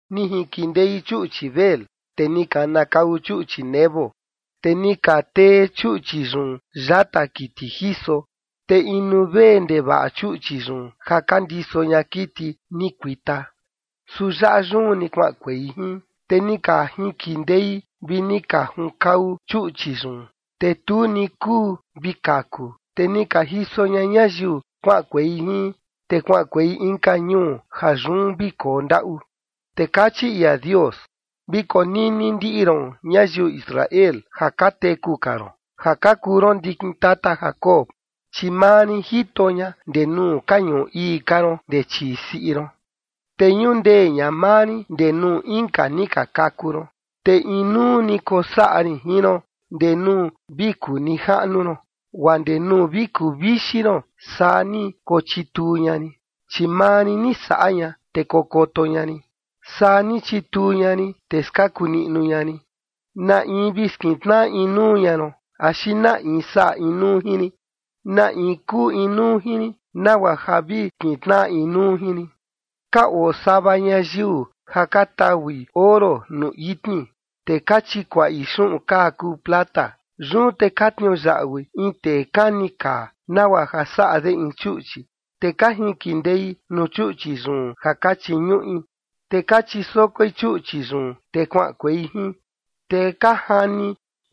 Ni jinkindei chuꞌchi Bel, te ni kanakau chuꞌchi Nebo, te ni ka tee chuꞌchi yun yata kiti jiso, te inu vee ndevaꞌa chuꞌchi yun ja ka ndiso ña kiti ni kuita, su yaꞌa yun ni kuaꞌankuei jin. Te ni ka jinkindei vi ni ka junkau chuꞌchi yun, te tu ni kuu vi kaku, te ni ka jiso ña ñayiu kuaꞌankuei jin, te kuaꞌankuei inka ñuu ja yun vi koo ndaꞌu. Te kachi ia Dios: “Vi konini ndiꞌi ron, ñayiu Israel, ja ka teku ka ron ja ka kuu ron ndikin tata Jacob, chi maa rin jito ña ndee nuu ka ñuꞌu ii ka ron ndee chii siꞌi ron. Te ñundee ña maa rin ndee nuu inka ni ka kaku ron. Te inuu ni kosaꞌa rin jin ron ndee nuu vi kuu nijaꞌnu ron, guaa ndee nuu vi kuvixi ron, saa ni kochituu ña rin, chi maa rin ni saꞌa ña, te kokoto ña rin, saa ni chituu ña rin, te skaku niꞌnu ña rin. ¿Na in vi skintnaꞌa inuu ña ron, axi na in saꞌa inuu jin rin? ¿Na in kuu inuu jin rin, nagua ja vi kintnaꞌa inuu jin rin? Ka oo sava ñayiu ja ka taui oro nuu itni, te ka chikuaꞌi xuꞌun kaa kuu plata. Yun te ka tniuyaꞌui in tee kani kaa nagua ja saꞌa de in chuꞌchi, te ka jinkindei nuu chuꞌchi yun ja ka chiñuꞌi. Te ka chisokoi chuꞌchi yun, te kuaꞌankuei jin, te ka jani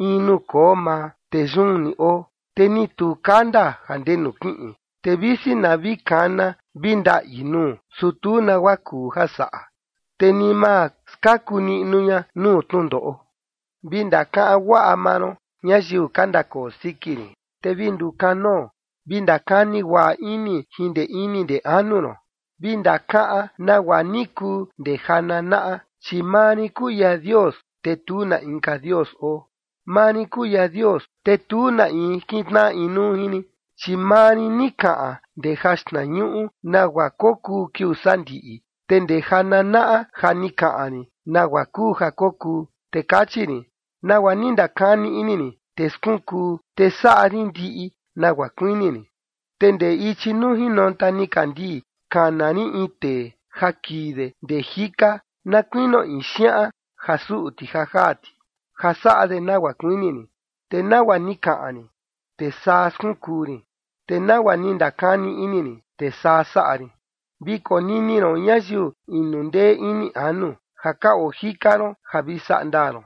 in nuu koo maa, te yun ni oo, te ni tu kanda ja ndenu kiꞌin. Te visi na vi kana vi ndaꞌi nuu, su tu nagua kuu ja saꞌa, te ni ma skaku niꞌnu ña nuu tnundoꞌo. ’Vi ndakaꞌan guaꞌa maa ron, ñayiu ka ndakoo siki rin, te vi ndukanoo, vi ndakani guaꞌa ini jin ndee ini ndee anu ron. Vi ndakaꞌan nagua ni kuu ndee ja nanaꞌa, chi maa rin kuu ia Dios, te tu na inka dios oo. Maa rin kuu ia Dios, te tu na in kintnaꞌa inuu jin rin. Chi maa rin ni kaꞌan ndee jaxtnañuꞌu nagua kokuu kiuu sandiꞌi, te ndee ja nanaꞌa ja ni kaꞌan rin nagua kuu ja kokuu. Te kachi rin: Nagua ni ndakani ini rin, te skunkuu, te saꞌa rin ndiꞌi nagua kuini rin. Te ndee ichi nuu jinonta nikandii kana rin in tee ja kii de ndee jika na kuinio in xiaꞌan ja suꞌu ti ja jaa ti, ja saꞌa de nagua kuini rin. Te nagua ni kaꞌan rin, te saa skunkuu rin. Te nagua ni ndakani ini rin, te saa saꞌa rin. Vi konini ron, ñayiu inu ndee ini anu, ja ka oo jika ron ja vi saꞌa ndaa ron.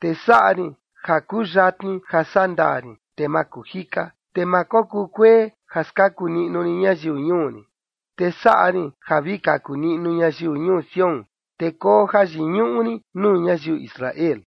Te saꞌa rin ja kuyatni ja sandaa rin, te ma kuu jika. Te ma kokuu kuee ja skaku niꞌnu rin ñayiu ñuu rin. Te saꞌa rin ja vi kaku niꞌnu ñayiu ñuu Sión, te koo jayiñuꞌu rin nuu ñayiu Israel.”